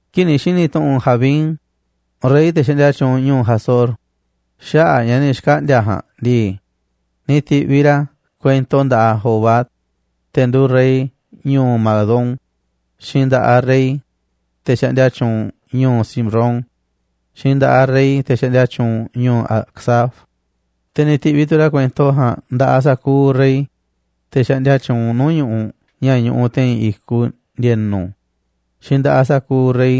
Kii̱ꞌ ni̱ xi̱ni̱ tu̱ꞌu̱n Jabín, rey te̱ xaꞌndia tyuunꞌ ñu̱u̱ Hazor, xaꞌa̱ꞌ ña̱ ni̱ xkaꞌndi̱a̱ ja̱a̱nꞌ ndii, ni̱ ti̱ꞌviꞌ ra̱ kuento nda̱ꞌaꞌ Jobab, te̱ nduuꞌ rey ñu̱u̱ Madón, xiinꞌ nda̱ꞌaꞌ rey, te̱ xaꞌndia tyuunꞌ ñu̱u̱ Simrón, xiinꞌ nda̱ꞌaꞌ rey, te̱ xaꞌndia tyuunꞌ ñu̱u̱ Acsaf, te̱ ni̱ ti̱ꞌviꞌ tu̱ ra̱ kuento ja̱a̱nꞌ nda̱ꞌaꞌ sa̱kuuꞌ rey, te̱ xaꞌndia tyuunꞌ nuu̱ꞌ ñu̱ꞌuꞌ ña̱ ñuꞌuꞌ te̱i̱n i̱kuꞌ ndi̱e̱nu̱, xiinꞌ nda̱ꞌaꞌ sa̱kuuꞌ rey,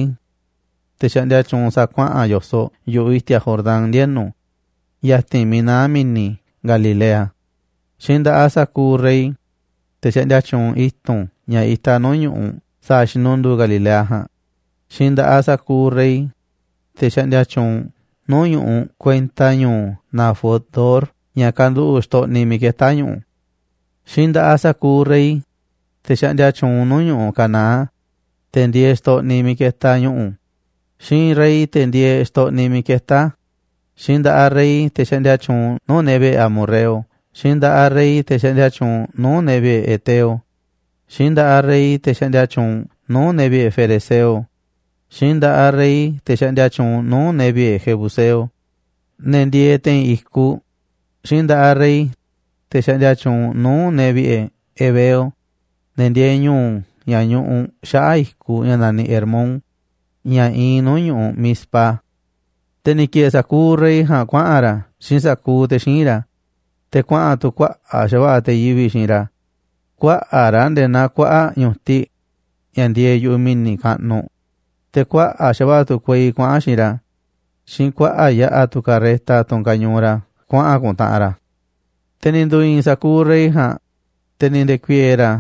te̱ xaꞌndia tyuunꞌ sa̱a̱ kuaꞌa̱n yo̱soꞌ yu̱ꞌuꞌ i̱ti̱a̱ Jordán ndienu̱ ya̱ti̱n miiꞌ naá mi̱ni̱ Galilea, xiinꞌ nda̱ꞌaꞌ sa̱kuuꞌ rey, te̱ xaꞌndia tyuunꞌ i̱tu̱n ña̱ itaꞌ nuu̱ꞌ ñu̱ꞌuꞌ sa̱a̱ xinunduu Galilea ja̱a̱nꞌ, xiinꞌ nda̱ꞌaꞌ sa̱kuuꞌ rey, te̱ xaꞌndia tyuunꞌ nuu̱ꞌ ñu̱ꞌuꞌ kuenta ñu̱u̱ Dor ña̱ kanduꞌu̱ꞌ xtoꞌniꞌ miiꞌ ketá ñu̱ꞌu̱. Xiinꞌ nda̱ꞌaꞌ sa̱kuuꞌ rey, te̱ xaꞌndia tyuunꞌ nuu̱ꞌ ñu̱ꞌuꞌ Canaán, te̱ ndieeꞌ xtoꞌniꞌ miiꞌ ketaꞌ ñu̱ꞌu̱, xiinꞌ rey, te̱ ndieeꞌ xtoꞌniꞌ miiꞌ ketá a̱, xiinꞌ nda̱ꞌaꞌ rey, te̱ xaꞌndia tyuunꞌ nuu̱ꞌ ne̱ vi̱ꞌe̱ amorreo, xiinꞌ nda̱ꞌaꞌ rey, te̱ xaꞌndia tyuunꞌ nuu̱ꞌ ne̱ vi̱ꞌe̱ heteo, xiinꞌ nda̱ꞌaꞌ rey, te̱ xaꞌndia tyuunꞌ nuu̱ꞌ ne̱ vi̱ꞌe̱ ferezeo, xiinꞌ nda̱ꞌaꞌ rey, te̱ xaꞌndia tyuunꞌ nuu̱ꞌ ne̱ vi̱ꞌe̱ jebuseo, ne̱ ndieeꞌ te̱i̱n i̱kuꞌ, xiinꞌ nda̱ꞌaꞌ rey, te̱ xaꞌndia tyuunꞌ nuu̱ꞌ ne̱ vi̱ꞌe̱ heveo, ne̱ ndieeꞌ ñu̱u̱ ña̱ ñuꞌuꞌ xaꞌa̱ꞌ i̱kuꞌ ña̱ naniꞌ Hermón, ña̱ iinꞌ nuu̱ꞌ ñu̱ꞌuꞌ Mizpa. Te̱ ni̱ ki̱e̱e̱ sa̱kuuꞌ rey ja̱a̱nꞌ kuaꞌa̱n ra̱ xiinꞌ sa̱kuuꞌ te̱ xíinꞌ ra̱, te̱ kuaꞌa̱n tu̱ kuaꞌa̱ꞌ xa̱va̱ꞌa̱ te̱ yivi̱ꞌ xiinꞌ ra̱, kuaꞌa̱ꞌ ra̱ nde̱e̱ naa kuaꞌa̱ꞌ ñu̱tiꞌ ña̱ ndieeꞌ yu̱ꞌuꞌ mi̱ni̱ kaꞌnuꞌ, te̱ kuaꞌa̱ꞌ xa̱va̱ꞌa̱ tu̱ kuei kuaꞌa̱n xiinꞌ ra̱, xiinꞌ kuaꞌa̱ꞌ yaꞌa̱ tu̱ carreta, tunꞌ kañuuꞌ ra̱ kuaꞌa̱n ku̱ntaꞌanꞌ ra̱. Te̱ ni̱ ndu̱i̱i̱n sa̱kuuꞌ rey ja̱a̱nꞌ, te̱ ni̱ nde̱ku̱i̱e̱e̱ ra̱,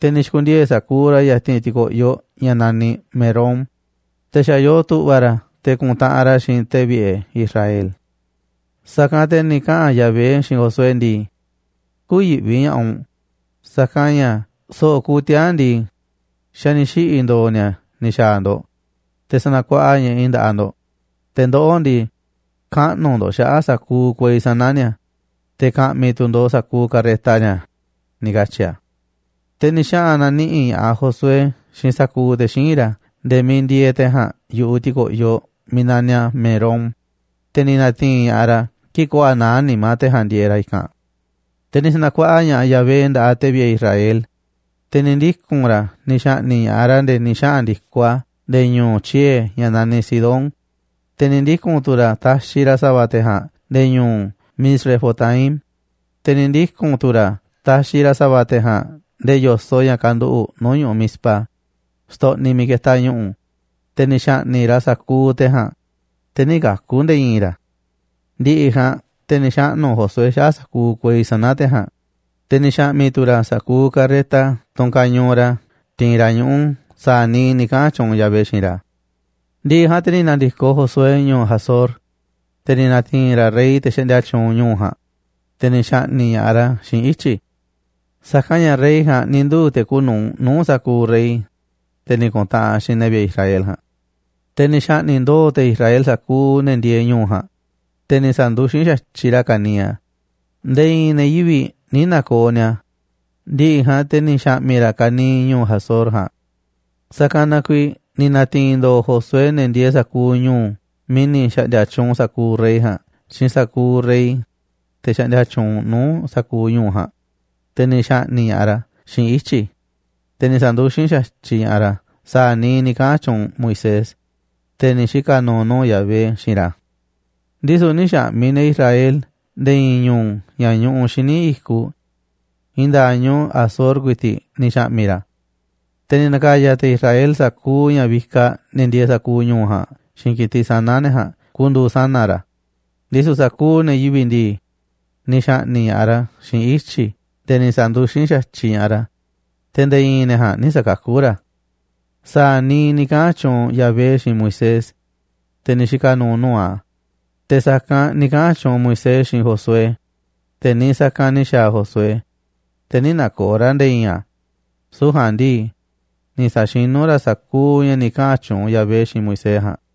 te̱ ni̱ xi̱ku̱ndiee̱ sa̱kuuꞌ ra̱ ya̱ti̱n ti̱ko̱ꞌyoꞌ ña̱ naniꞌ Merom, te̱ xa̱ yoo tu̱ꞌva̱ ra̱ te̱ ku̱ntaꞌanꞌ ra̱ xiinꞌ te̱ vi̱ꞌe̱ Israel. Sa̱kanꞌ te̱ ni̱ kaꞌa̱n Yahvé xiinꞌ Josué ndii: ―Kü̱yi̱ꞌvi ña̱ꞌaꞌ u̱nꞌ, sa̱kanꞌ ña̱ so̱ꞌo̱ kuuꞌ tiaa̱n ndii, xa̱ ni̱ xiꞌi̱ ndo̱o̱ ni̱a̱ ni̱ xa̱a̱ ndo̱ꞌ, te̱ sa̱na̱kuaꞌa ña̱ꞌaꞌ i̱ nda̱ꞌaꞌ ndo̱ꞌ, te̱ ndoꞌó ndii, kaꞌnu̱ ndo̱ꞌ xaꞌa̱ꞌ sa̱kuuꞌ kuei sana̱ ni̱a̱, te̱ ka̱ꞌmi̱ tu̱ ndo̱ꞌ sa̱kuuꞌ carreta ni̱a̱ ―ni̱ katyi̱ a̱. Te̱ ni̱ xaꞌa̱n na̱niꞌi̱ꞌ ña̱ꞌaꞌ Josué xiinꞌ sa̱kuuꞌ te̱ xíinꞌ ra̱ nde̱e̱ miiꞌ ndieeꞌ te̱ ja̱a̱nꞌ yu̱ꞌuꞌ ti̱ko̱ꞌyoꞌ miiꞌ naniꞌ a̱ Merom, te̱ ni̱ na̱ti̱i̱n ña̱ꞌaꞌ ra̱ kii̱ꞌ köo̱ꞌ a̱ naá nimá te̱ ja̱a̱nꞌ ndieeꞌ ra̱ i̱kanꞌ. Te̱ ni̱ sa̱na̱kuaꞌa ña̱ꞌaꞌ Yahvé nda̱ꞌaꞌ te̱ vi̱ꞌe̱ Israel, te̱ ni̱ ndiku̱n ra̱ ni̱ xa̱ꞌni̱ꞌ ña̱ꞌaꞌ ra̱ nde̱e̱ ni̱ xaꞌa̱n ndi̱koꞌ ra̱ nde̱e̱ ñu̱u̱ tyiee̱ ña̱ naniꞌ Sidón, te̱ ni̱ ndiku̱n tu̱ ra̱ taxiꞌ ra̱ sa̱va̱ te̱ ja̱a̱nꞌ nde̱e̱ ñu̱u̱ Misrefotmaim, te̱ ni̱ ndiku̱n tu̱ ra̱ taxiꞌ ra̱ sa̱va̱ te̱ ja̱a̱nꞌ nde̱e̱ yo̱soꞌ ña̱ kanduꞌuꞌ nuu̱ꞌ ñu̱ꞌuꞌ Mizpa, xtoꞌniꞌ miiꞌ ketaꞌ ñu̱ꞌu̱, te̱ ni̱ xa̱ꞌni̱ꞌ ra̱ sa̱kuuꞌ te̱ ja̱a̱nꞌ, te̱ nï̱ kaku̱ nde̱e̱ i̱i̱n ra̱. Ndi̱ꞌi̱ ja̱a̱nꞌ te̱ ni̱ xaꞌnu̱ Josué xaꞌa̱ꞌ sa̱kuuꞌ kuei sana̱ te̱ ja̱a̱nꞌ, te̱ ni̱ xa̱ꞌmi̱ tu̱ ra̱ sa̱kuuꞌ carreta, tunꞌ kañuuꞌ ra̱ tiinꞌ ra̱ ñuꞌu̱, sa̱a̱ niiꞌ ni̱ kaꞌa̱n tyuunꞌ Yahvé xiinꞌ ra̱. Ndi̱ꞌi̱ ja̱a̱nꞌ te̱ ni̱ na̱ndi̱koꞌ Josué ñu̱u̱ Hazor, te̱ ni̱ na̱ti̱i̱n ra̱ rey, te̱ xaꞌndia tyuunꞌ ñu̱u̱ ja̱a̱nꞌ, te̱ ni̱ xa̱ꞌni̱ꞌ ña̱ꞌaꞌ ra̱ xiinꞌ ityi̱. Sa̱kanꞌ ña̱ rey ja̱a̱nꞌ ni̱ nduu̱ te̱ kuuꞌ nu̱uꞌ nuu̱ꞌ sa̱kuuꞌ rey, te̱ ni̱ ku̱ntaꞌanꞌ xiinꞌ ne̱ vi̱ꞌe̱ Israel ja̱a̱nꞌ. Te̱ ni̱ xa̱ꞌni̱ꞌ ndo̱o̱ te̱ Israel sa̱kuuꞌ ne̱ ndieeꞌ ñu̱u̱ ja̱a̱nꞌ, te̱ ni̱ sa̱nduxín xa̱tyiꞌ ra̱ ka̱niiꞌ a̱, nde̱e̱ i̱i̱n ne̱ yivi̱ꞌ nï̱ na̱ko̱o̱ ni̱a̱. Ndi̱ꞌi̱ ja̱a̱nꞌ te̱ ni̱ xa̱ꞌmi̱ ra̱ ka̱niiꞌ ñu̱u̱ Hazor ja̱a̱nꞌ. Sa̱kanꞌ na kuiiꞌ ni̱ na̱ti̱i̱n ndo̱o̱ Josué ne̱ ndieeꞌ sa̱kuuꞌ ñu̱u̱ miiꞌ ni̱ xa̱ꞌndi̱a̱ tyuunꞌ sa̱kuuꞌ rey ja̱a̱nꞌ xiinꞌ sa̱kuuꞌ rey, te̱ xaꞌndia tyuunꞌ nuu̱ꞌ sa̱kuuꞌ ñu̱u̱ ja̱a̱nꞌ, te̱ ni̱ xa̱ꞌni̱ꞌ ña̱ꞌaꞌ ra̱ xiinꞌ ityi̱, te̱ ni̱ sa̱nduxín xa̱tyiꞌ ña̱ꞌaꞌ ra̱ sa̱a̱ niiꞌ ni̱ kaꞌa̱n tyuunꞌ Moisés, te̱ ni̱ xika̱ nu̱u̱ nuu̱ꞌ Yahvé, xiinꞌ ra̱. Ndisu̱ nï̱ xa̱ꞌmi̱ te̱ Israel nde̱e̱ i̱i̱n ñu̱u̱ ña̱ ñuꞌuꞌ xíniꞌ i̱kuꞌ, i̱i̱n nda̱a̱ꞌ ñu̱u̱ Hazor ku̱i̱ti̱ꞌ ni̱ xa̱ꞌmi̱ ra̱. Te̱ ni̱ na̱ka̱ya̱ te̱ Israel sa̱kuuꞌ ña̱ vikaꞌ ne̱ ndieeꞌ sa̱kuuꞌ ñu̱u̱ ja̱a̱nꞌ xiinꞌ ki̱tiꞌ sana̱ ne̱ ja̱a̱nꞌ ku̱ndu̱u̱ sana̱ ra̱. Ndisu̱ sa̱kuuꞌ ne̱ yivi̱ꞌ ndii, ni̱ xa̱ꞌni̱ꞌ ña̱ꞌaꞌ ra̱ xiinꞌ ityi̱ nde̱e̱ ni̱ sa̱nduxín xa̱tyiꞌ ña̱ꞌaꞌ ra̱, te̱ nde̱e̱ i̱i̱n ne̱ ja̱a̱nꞌ nï̱ sa̱kakú ra̱. Sa̱a̱ niiꞌ ni̱ kaꞌa̱n tyuunꞌ Yahvé xiinꞌ Moisés, te̱ ni̱ xika̱ nu̱u̱ nuu̱ꞌ a̱, te̱ sa̱kanꞌ ni̱ kaꞌa̱n tyuunꞌ Moisés xiinꞌ Josué, te̱ niiꞌ sa̱kanꞌ ni̱ xa̱a̱ Josué, te̱ nï̱ na̱ko̱o̱ ra̱ nde̱e̱ i̱i̱n a̱, süu̱ꞌ ja̱a̱nꞌ ndii, ni̱ sa̱xinú ra̱ sa̱kuuꞌ ña̱ ni̱ kaꞌa̱n tyuunꞌ Yahvé xiinꞌ Moisés ja̱a̱nꞌ.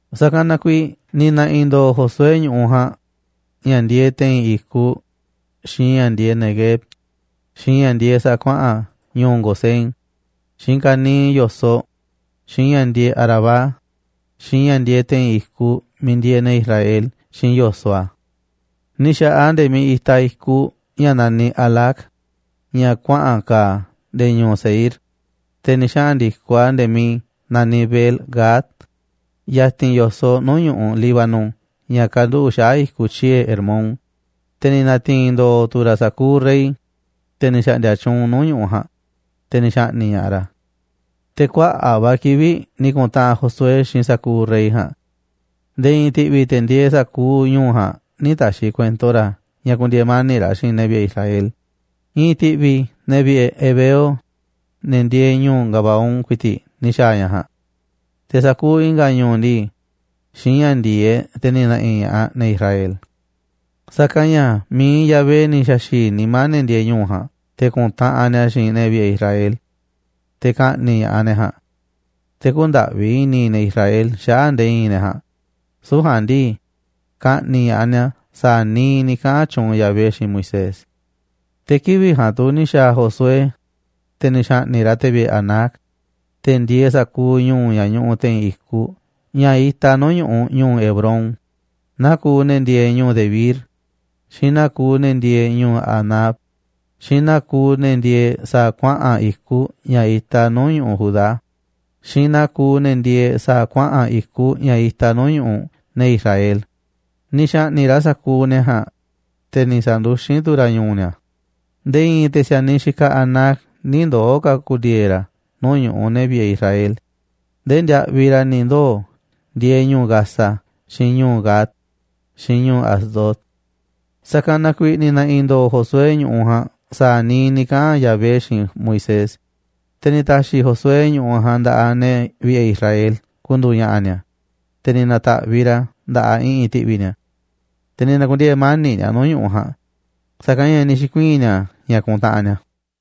Sa̱kanꞌ na kuiiꞌ ni̱ na̱ꞌi̱ ndo̱o̱ Josué ñu̱ꞌuꞌ ja̱a̱nꞌ: ña̱ ndieeꞌ te̱i̱n i̱kuꞌ, xiinꞌ ña̱ ndieeꞌ Neguev, xiinꞌ ña̱ ndieeꞌ sa̱a̱ kuaꞌa̱n ñu̱u̱ Gosén, xiinꞌ ka̱niiꞌ yo̱soꞌ, xiinꞌ ña̱ ndieeꞌ Arabá, xiinꞌ ña̱ ndieeꞌ te̱i̱n i̱kuꞌ miiꞌ ndieeꞌ ne̱ Israel xiinꞌ yo̱soꞌ a̱. Ni̱ xa̱ꞌaꞌ a̱ nde̱e̱ miiꞌ itaꞌ i̱kuꞌ ña̱ naniꞌ Halac, ña̱ kuaꞌa̱n ka̱a̱ nde̱e̱ ñu̱u̱ Seír, te̱ ni̱ xaꞌa̱n ndi̱koꞌ a̱ nde̱e̱ miiꞌ naniꞌ Baal-gad, ya̱ti̱n yo̱soꞌ nuu̱ꞌ ñu̱ꞌuꞌ Líbano ña̱ kanduꞌu̱ꞌ xaꞌa̱ꞌ i̱kuꞌ tyiee̱ Hermón. Te̱ ni̱ na̱ti̱i̱n ndo̱o̱ tu̱ ra̱ sa̱kuuꞌ rey, te̱ ni̱ xa̱ꞌndi̱a̱ tyuunꞌ nuu̱ꞌ ñu̱ꞌuꞌ ja̱a̱nꞌ, te̱ ni̱ xa̱ꞌni̱ꞌ ña̱ꞌaꞌ ra̱. Te̱ kuaꞌa̱ꞌ va̱ kivi̱ꞌ ni̱ ku̱ntaꞌanꞌ Josué xiinꞌ sa̱kuuꞌ rey ja̱a̱nꞌ. Nde̱e̱ i̱i̱n ti̱ꞌvi̱ te̱ ndieeꞌ sa̱kuuꞌ ñu̱u̱ ja̱a̱nꞌ nï̱ ta̱xi̱ kuento ra̱ ña̱ ku̱ndi̱e̱e̱ mani̱ꞌ ra̱ xiinꞌ ne̱ vi̱ꞌe̱ Israel. I̱i̱n ti̱ꞌvi̱ ne̱ vi̱ꞌe̱ heveo, ne̱ ndieeꞌ ñu̱u̱ Gabaón, ku̱i̱ti̱ꞌ ni̱ xa̱a̱ ña̱ ja̱a̱nꞌ. Te̱ sa̱kuuꞌ i̱nga̱ ñu̱u̱ ndii, xiinꞌ ña̱ ndi̱e̱eꞌ te̱ ni̱ na̱ꞌi̱ ña̱ꞌaꞌ ne̱ Israel. Sa̱kanꞌ ña̱ mi̱iꞌ Yahvé ni̱ xa̱xi̱i̱ nimá ne̱ ndieeꞌ ñu̱u̱ ja̱a̱nꞌ te̱ ku̱ntaꞌanꞌ ni̱a̱ xiinꞌ ne̱ vi̱ꞌe̱ Israel, te̱ ka̱ꞌni̱ꞌ ña̱ꞌaꞌ ne̱ ja̱a̱nꞌ. Te̱ kü̱ndaꞌvi i̱ni̱ ne̱ Israel xaꞌa̱ꞌ nde̱e̱ i̱i̱n ne̱ ja̱a̱nꞌ, süu̱ꞌ ja̱a̱nꞌ ndii, ka̱ꞌni̱ꞌ ña̱ꞌaꞌ ni̱a̱ sa̱a̱ niiꞌ ni̱ kaꞌa̱n tyuunꞌ Yahvé xiinꞌ Moisés. Te̱ kivi̱ꞌ ja̱a̱nꞌ tu̱ ni̱ xa̱a̱ Josué, te̱ ni̱ xa̱ꞌni̱ꞌ ra̱ te̱ vi̱ꞌe̱ Anac, te̱ ndieeꞌ sa̱kuuꞌ ñu̱u̱ ña̱ ñuꞌuꞌ te̱i̱n i̱kuꞌ ña̱ itaꞌ nuu̱ꞌ ñu̱ꞌuꞌ ñu̱u̱ Hebrón, naa kuuꞌ ne̱ ndieeꞌ ñu̱u̱ Debir, xiinꞌ naa kuuꞌ ne̱ ndieeꞌ ñu̱u̱ Anab, xiinꞌ naa kuuꞌ ne̱ ndieeꞌ sa̱a̱ kuaꞌa̱n i̱kuꞌ ña̱ itaꞌ nuu̱ꞌ ñu̱ꞌuꞌ Judá, xiinꞌ naa kuuꞌ ne̱ ndieeꞌ sa̱a̱ kuaꞌa̱n i̱kuꞌ ña̱ itaꞌ nuu̱ꞌ ñu̱ꞌuꞌ ne̱ Israel, ni̱ xa̱ꞌni̱ꞌ ra̱ sa̱kuuꞌ ne̱ ja̱a̱nꞌ, te̱ ni̱ sa̱nduxín tu̱ ra̱ ñu̱u̱ ni̱a̱. Nde̱e̱ i̱i̱n te̱ si̱a̱niꞌ xikaꞌ Anac nï̱ ndoo̱ ka̱ ku̱ndi̱e̱e̱ ra̱ nuu̱ꞌ ñu̱ꞌuꞌ ne̱ vi̱ꞌe̱ Israel, ndee ndiaꞌviꞌ ra̱ ni̱ ndoo̱ ndieeꞌ ñu̱u̱ Gaza, xiinꞌ ñu̱u̱ Gad, xiinꞌ ñu̱u̱ Asdod. Sa̱kanꞌ na kuiiꞌ ni̱ na̱ꞌi̱ ndo̱o̱ Josué ñu̱ꞌuꞌ ja̱a̱nꞌ sa̱a̱ niiꞌ ni̱ kaꞌa̱n Yahvé xiinꞌ Moisés. Te̱ ni̱ ta̱xi̱ Josué ñu̱ꞌuꞌ ja̱a̱nꞌ nda̱ꞌaꞌ ne̱ vi̱ꞌe̱ Israel ku̱ndu̱u̱ ña̱ꞌa̱ ni̱a̱, te̱ ni̱ na̱ta̱ꞌviꞌ ra̱ a̱ nda̱ꞌaꞌ i̱ꞌi̱n ti̱ꞌvi̱ ni̱a̱. Te̱ ni̱ na̱ku̱ndiee̱ mani̱ꞌ ni̱a̱ nuu̱ꞌ ñu̱ꞌuꞌ ja̱a̱nꞌ, sa̱kanꞌ ña̱ ni̱ xi̱kuii̱n ni̱a̱ ña̱ kuntaꞌanꞌ ni̱a̱.